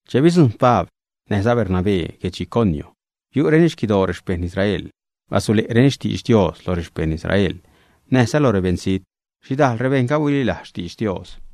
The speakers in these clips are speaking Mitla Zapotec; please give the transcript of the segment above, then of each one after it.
Che bidzujṉ Pabl näjza Bernabé guedx Iconio, biu'reni xquidoo rexpejṉ Israel. Basule'reni xtidx Dios lo rexpejṉ Israel näjza lo rebeṉzijt. Xhidajl rebejṉga huililajz xtidx Dios.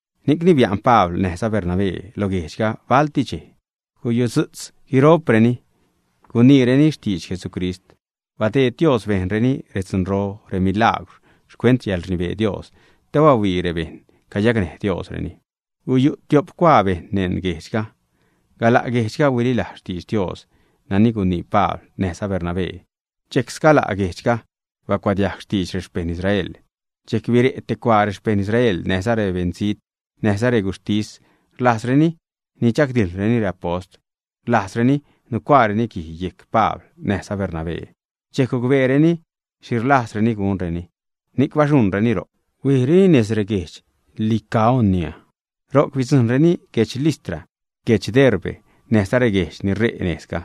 Ni'cni bia'n Pabl näjza Bernabé lo guejdxga balti dxej. Gusutzu'tz guiro'preni guniireni xtidx Jesucrist. Badeed Dios bejnreni redzunro, remilagwr xcuent xcäḻrnibee Dios te bahuii bejṉ cayacnäj Diosreni. Guyu' tiop cuaa bejṉ neṉ guejdxga. Gala' guejdxga huililajz xtidx Dios nani gunii Pabl näjza Bernabé, dxejc sgala' guejdxga bacuadiajg xtidx rexpejṉ Israel. Dxejc bire' te cuaa rexpejṉ Israel, näjza beṉzijt, näjza reguxhtis, rlajzreni nidxagdijḻreni reapost, rlajzzareni nucuaareni guij yejc Pabl näjza Bernabé. Dxejc gucbeereni xhi rlajzreni gunreni, ni'c baxuṉreni ro'c huijreni nez reguedx Licaonia, ro'c bidzujṉreni guedx Listra, guedx Derbe, näjza reguejdx ni ṟe' nejzga.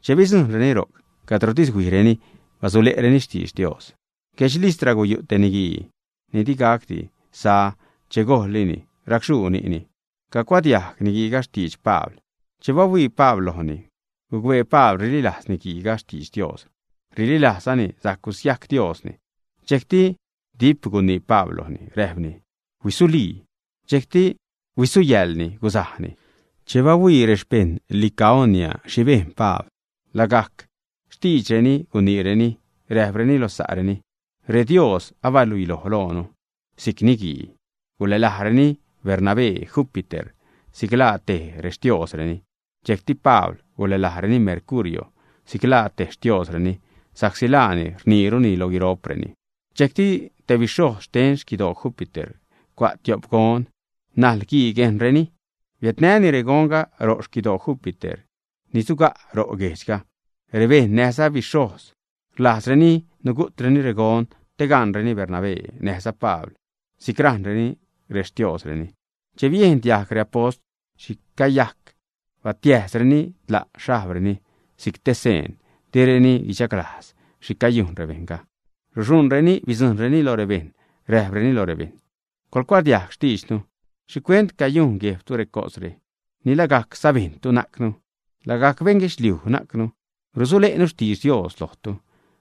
Che bidzujṉreni ro'c, cadrotis huijreni basule'reni xtidx Dios. Guedx Listra guyu' te niguii ni digacdi sa, che gojllini racxhuu ni'ni. Cagucuadiajg niguiiga xtidx Pabl. Che bahuii Pabl lojni, gucbee Pabl rililajz niguiiga xtidx Dios, rililajzzani sajc gusiajc Diosni. Dxejcti dip gunii Pabl lojni, räjpni: ―¡Huisulii! Dxejcti huisuyäḻni, gusajni. Che bahuii rexpejṉ Licaonia xhi bejn Pabl, lagajc xtiidxreni guniireni, räjpreni lo sa'reni: ―¡Redios abiädluiloj loonu si'c niguii! Gulälajreni Bernabé Júpiter, si'c laa tej rextiosreni. Dxejcti Pabl gulälajreni Mercurio, si'c laa stee rextiosreni, sa'csi laani rniiruni lo guiro'preni. Dxejcti te bixhojz xten xquidoo Júpiter cua' tiop gon najl guii guejnreni. Biädnäni regonga ro' xquidoo Júpiter ni suga' ro' guejdxga. Rebejṉ näjza bixhojz rlajzreni nugu'treni regon te gaṉreni Bernabé näjza Pabl si'c rajṉreni rextiosreni. Che biejn diajg reapost xhi cayajc, batiäjsreni tla' xhajbreni si'c te seen direni guichaglajz xhi cayujn rebejṉga. Ruxuṉreni bidzujṉreni lo rebejṉ, räjpreni lo rebejṉ: ―Coḻcuadiajg xtiidxnu. ¿Xhicuent cayujn guejbtu recosre? Ni lagajc sabejṉtu najcnu, lagajc beṉ guedxliuj najcnu. Rusule'nu xtidx Dios lojtu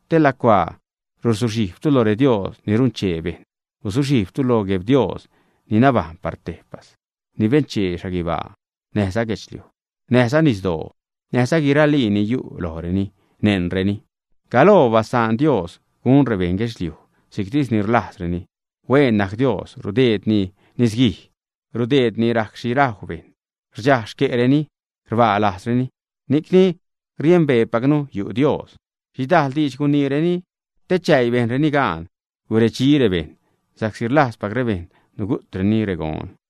te lacuaa ruzuxhijbtu lo redios ni runchee bejṉ, guzuxhijbtu lo Gueb Dios ni nabajṉ par tejpas, ni benchee xhaguibaa näjza guedxliuj, näjza nisdoo, näjza guiralii ni yu' lojreni, neṉreni, Galoo basaan Diosga gun rebeṉ guedxliuj si'ctis ni rlajzreni. Huen najc Dios, rudeedni nisguij, rudeedni rajc xhi rajw rebejṉ, rdxaj xque'reni, rbaa lajzreni. Ni'cni riembeepacnu yu' Dios. Xhidajl diidx guniireni te chäii bejnreni gaan guredxi rebejṉ, sa'csi rlajzpac rebejṉ nugu'treni regon.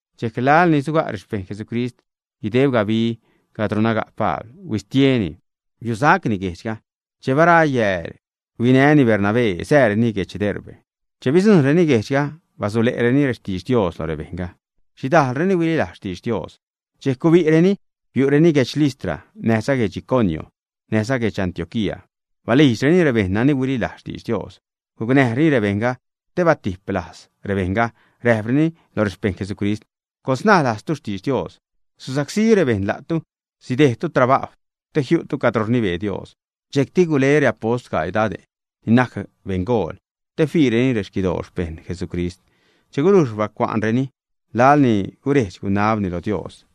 Dxejc laḻ ni suga' rexpejṉ Jesucrist guideb gabi cadro naga' Pabl, huistieni, biusacni guejdxga. Che bara yääl, huinäni Bernabé sääreni guedx Derbe. Che bidzujṉreni guejdxga, basule'reni rextidx Dios lo rebejṉga. Xhidajlreni huililajz xtidx Dios. Dxejc gubi'reni, biu'reni guedx Listra, näjza guedx Iconio, näjza guedx Antioquía. Balijdxreni rebejṉ nani huililajz xtidx Dios, gucnäjreni rebejṉga te batiplajz rebejṉga, räjpreni lo rexpejṉ Jesucrist: ―Coḻsnaj lajztu xtidx Dios. Susacsí rebejṉ la'tu, sidejdtu trabajw te jiu'tu cadro rnibee Dios. Dxejcti gule reapost gaii dade' ni najc beṉgool te fiireni rexquidoo xpejṉ Jesucrist. Che gulujx bacua'nreni, laḻ ni guredx-gunabreni lo Dios,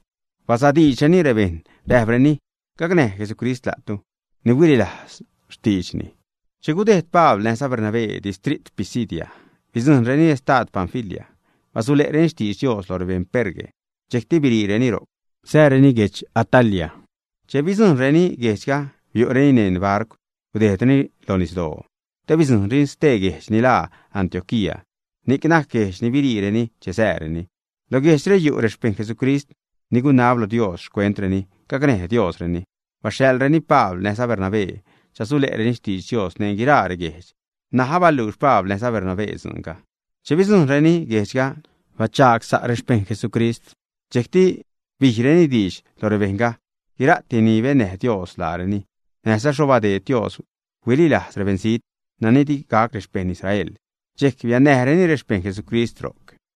basadiidxreni rebejṉ, räjpreni: “Gacnäj Jesucrist la'tu ni huililajz xtiidxni.” Che gudejd Pabl näjza Bernabé distrit Pisidia, bidzujṉreni estad Panfilia. Basule'reni xtidx Dios lo rebeṉ Perge, dxejcti biriireni ro'c sääreni guedx Atalia. Che bidzujṉreni guejdxga, biu'reni neṉ barcw, gudejdreni lo nisdoo te bidzujṉreni stee guejdx ni laaza Antioquía. Ni'c najc guejdx ni biriireni che sääreni. Lo guejdxre yu' rexpejṉ Jesucrist ni gunab lo Dios xcuentreni, gacnäj Diosreni, baxhaḻreni Pabl näjza Bernabé chasule'reni xtidx Dios neṉ guiraa reguejdx. N̲aj abaluux Pabl näjza Bernabé dzuunga. Che bidzujṉreni guejdxga, bachagsa' rexpejṉ Jesucrist. Dxejcti bijreni diidx lo rebejṉga guira'ti ni bennäj Dios laareni, näjza xho badeed Dios huililajz rebeṉzijt nani digac rexpeṉ Israel. Xchej biannäjreni rexpejṉ Jesucrist ro'c.